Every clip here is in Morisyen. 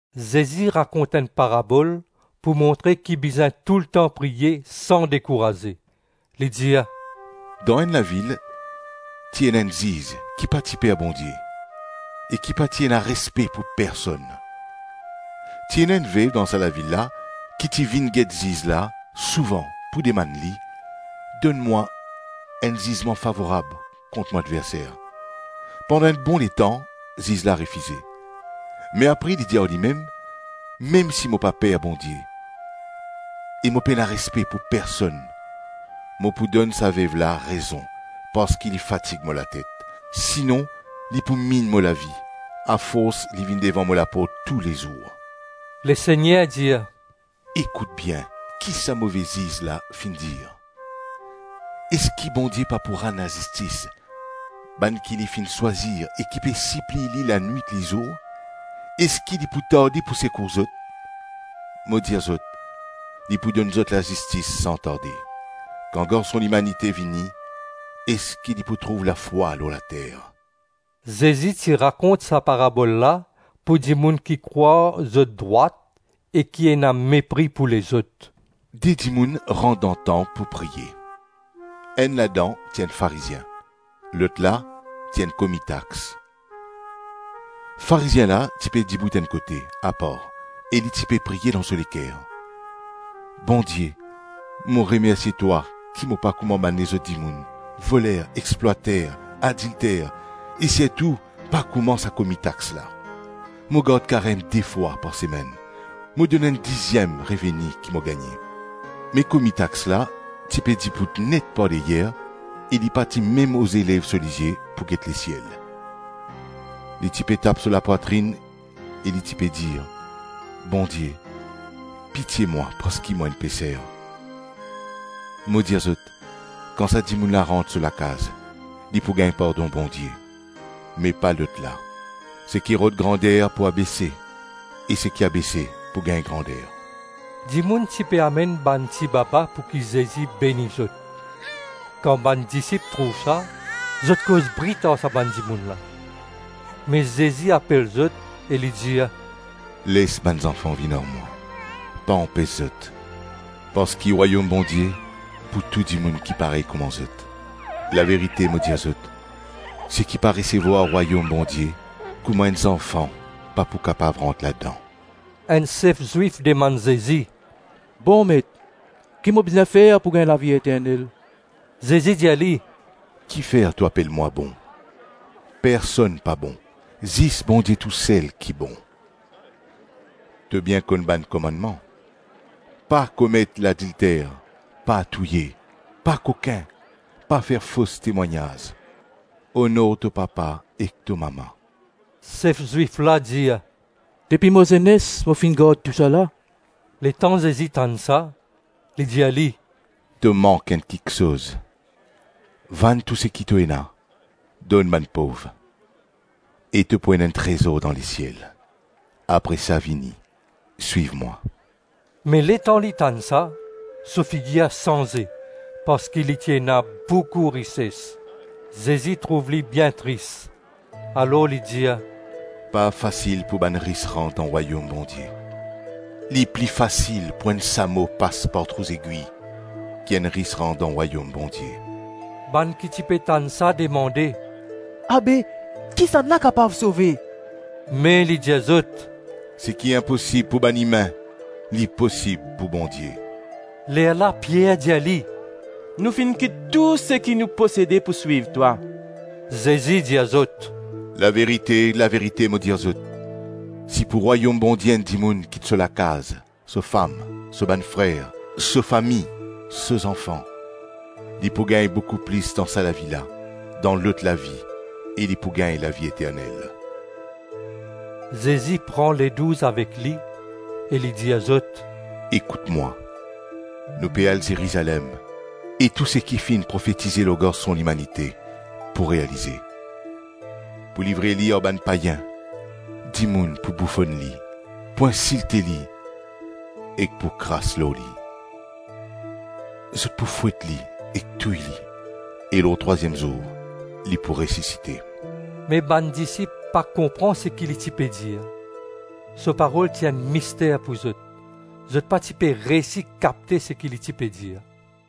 Zezi rakont enn parabol pou montre ki bizin toultan priye san dekouraze. Li dir, “Dan enn lavil ti ena enn ziz ki pa ti per Bondie e ki pa ti ena respe pou personn. Ti ena enn vev dan sa lavil la ki ti vinn get ziz la souvan pou dimann li, ‘Donn mwa enn zizman favorab kont mo adverser.’ Pandan enn bon letan ziz la refize; me apre li dir ar limem, ‘Mem si mo pa per Bondie e mo pa ena respe pou personn, mo pou donn sa vev la rezon parski li fatig mo latet; sinon li pou minn mo lavi afors li vinn devan mo laport toulezour.’” Lesegner dir, “Ekout bien ki sa move ziz la finn dir. Eski Bondie pa pou rann lazistis bann ki li finn swazir e ki pe sipliy li lanwit-lizour? Eski li pou tarde pou sekour zot? Mo dir zot, li pou donn zot lazistis san tarde. Kan Garson Limanite vini, eski li pou trouv lafwa lor later?” Zezi ti rakont sa parabol la pou dimoun ki krwar zot drwat e ki ena mepri pou lezot. “De dimoun rant dan tanp pou priye; enn ladan ti enn Farizien, lotla ti enn komi tax. Farizien la ti pe dibout enn kote, apar, e li ti pe priye dan so leker, ‘Bondie, mo remersie twa ki mo pa kouma bann lezot dimoun, voler, explwater, adilter, e sirtou pa kouma sa komi tax la. Mo gard karem de fwa par semenn, mo donn enn diziem reveni ki mo gagne.’ Me komi tax la, ti pe dibout net par deryer e li pa ti mem oze lev so lizie pou get lesiel. Li ti pe tap so lapwatrinn e li ti pe dir, ‘Bondie, pitie mwa parski mo enn peser!’ Mo dir zot, kan sa dimoun la rant so lakaz li pou gagn pardon Bondie, me pa lotla. Seki rod grander pou abese, e seki abese pou gagn grander.” Dimoun ti pe amenn bann tibaba pouki Zezi beni zot. Kan bann disip trouv sa, zot koz brit ar sa bann dimoun la. Me Zezi apel zot e li dir, “Les bann zanfan vinn ar mwa. Pa anpes zot, parski Rwayom Bondie pou tou dimoun ki parey kouma zot. Laverite, mo dir zot, seki pa resevwar Rwayom Bondie kouma enn zanfan pa pou kapav rant ladan.” Enn sef Zwif dimann Zezi, “Bon Met, ki mo bizin fer pou gagn lavi eternel?” Zezi dir li, “Kifer to apel mwa bon? Personn pa bon, zis Bondie tousel ki bon. To bien konn bann komannman: Pa komet ladilter, pa touye, pa kokin, pa fer fos temwagnaz, onor to papa ek to mama.” Sef Zwif la dir, “Depi mo zenes mo finn gard tousala.” Letan Zezi tann sa, li dir li, “To mank enn kiksoz. Vann tou seki to ena, donn bann pov, e to pou ena enn trezor dan lesiel; apre sa vini, swiv mwa.” Me letan li tann sa, so figir sanze, parski li ti ena boukou rises. Zezi trouv li bien tris, alor li dir, “Pa fasil pou bann ris rant dan Rwayom Bondie! Li pli fasil pou enn samo pas par trou zegwi ki enn ris rant dan Rwayom Bondie.” Bann ki ti pe tann sa demande, “Abe kisannla kapav sove?” Me li dir zot, “Seki inposib pou bann imin, li posib pou Bondie.” Lerla Pier dir li, “Nou finn kit tou seki nou posede pou swiv twa.” Zezi dir zot, “Laverite, laverite, mo dir zot, si pou Rwayom Bondie enn dimoun kit so lakaz, so fam, so bann frer, so fami, so zanfan, li pou gagn boukou plis dan sa lavi la, dan lot lavi e li pou gagn lavi eternel.” Zezi pran Ledouz avek li e li dir zot, “Ekout mwa, nou pe al Zerizalem, e tou seki finn profetize lor Garson Limanite pou realize. Pou livre li ar bann payin, dimoun pou boufonn li, pou insilte li ek pou kras lor li. Zot pou fwet li, ek touy li, e lor trwaziem zour li pou resisite.” Me bann disip pa konpran seki li ti pe dir. So parol ti enn mister pou zot; zot pa ti pe reysi kapte seki li ti pe dir.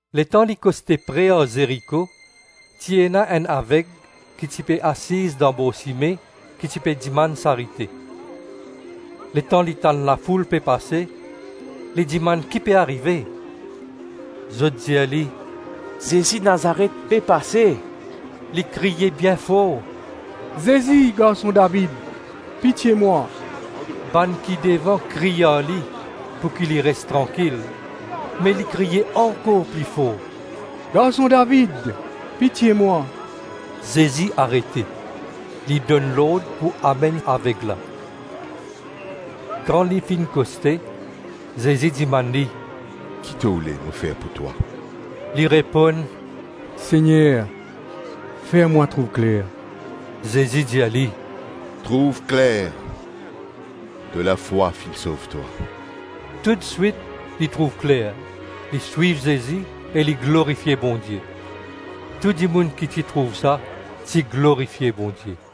Letan li koste pre ar Zeriko, ti ena enn aveg ki ti pe asiz dan bor sime, ti pe dimann sarite. Letan li tann lafoul pe pase, li dimann ki pe arive. Zot dir li, “Zezi Nazaret pe pase.” Li kriye bien for, “Zezi, Garson David, pitie mwa!” Bann ki devan kriy ar li pouki li res trankil, me li kriye ankor pli for, “Garson David, pitie mwa!” Zezi arete, li donn lord pou amenn aveg la; kan li finn koste, Zezi dimann li, “Ki to oule mo fer pou twa?” Li reponn, “Segner, fer mwa trouv kler.” Zezi dir li, “Trouv kler. To lafwa finn sov twa.” Toutswit li trouv kler, li swiv Zezi, e li glorifie Bondie. Tou dimoun ki ti trouv sa, ti glorifie Bondie.